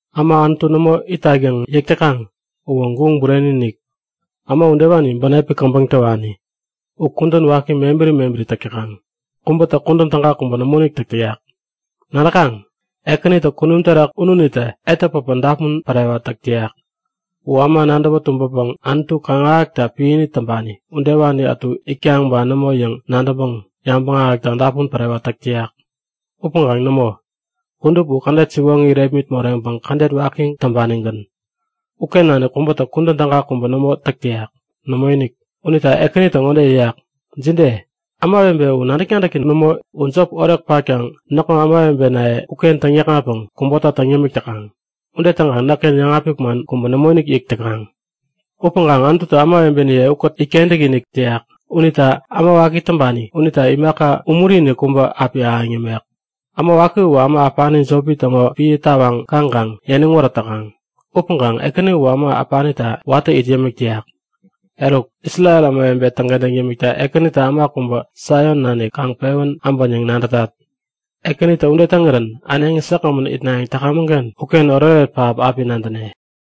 Äma Anutu nämo itak yäŋ yäk täkaŋ uwä guŋ bureni-inik! Äma udewani bänepi käbäŋ täwani. U kudän waki mebäri mebäri täk täkaŋ. Kubätä kudän täga kubä nämoinik täk täyak. Nadäkaŋ? Ekänitä kunum terak ununitä etä päpä dapun pärewat täk täyak. U äma nadäwä tumbäpäŋ Anutu kaŋ-ahäkta piäni täŋpani udewani ätu itkaŋ ba nämo yäŋ nadäŋpäŋ yabäŋ ahäkta dapun pärewat täk täyak. Upäŋkaŋ nämo, kudup u kädet siwoŋi irepmit moreŋpäŋ kädet waki täŋpanigän. Uken nanik kubätä kudän täga kubä nämo täk täyak. Nämoinik. Unita Ekänitä ŋode yäyak; Jide? Ämawebe u nadäk-nadäki nämo? U jop orek patkaŋ näkŋo ämawebenaye uken täŋyäkŋatpäŋ kubota täŋ yämik täkaŋ. Ude täŋkaŋ näkken yäŋapik man kubä nämoinik yäk täkaŋ. Upäŋkaŋ Anututä ämawebeniye ukät itkentäk-inik täyak unita äma waki täŋpani unita imaka umuri-inik kubä api ahäŋ yämek. Äma waki uwä äma äpani jopi täŋo piä tawaŋ kaŋkaŋ yäniŋ wärät täkaŋ. Upäŋkaŋ Ekäni uwä äma äpanita watä it yämik täyak. Eruk, Isrel ämawebe täŋkentäŋ yämikta Ekänitä äma kubä Saion nanik kaŋ pewän äbän yäŋ nadätat. Ekänitä ude täŋirän äneŋi säkgämän itnayäŋ täkamäŋken uken oretoret pähap api nadäne!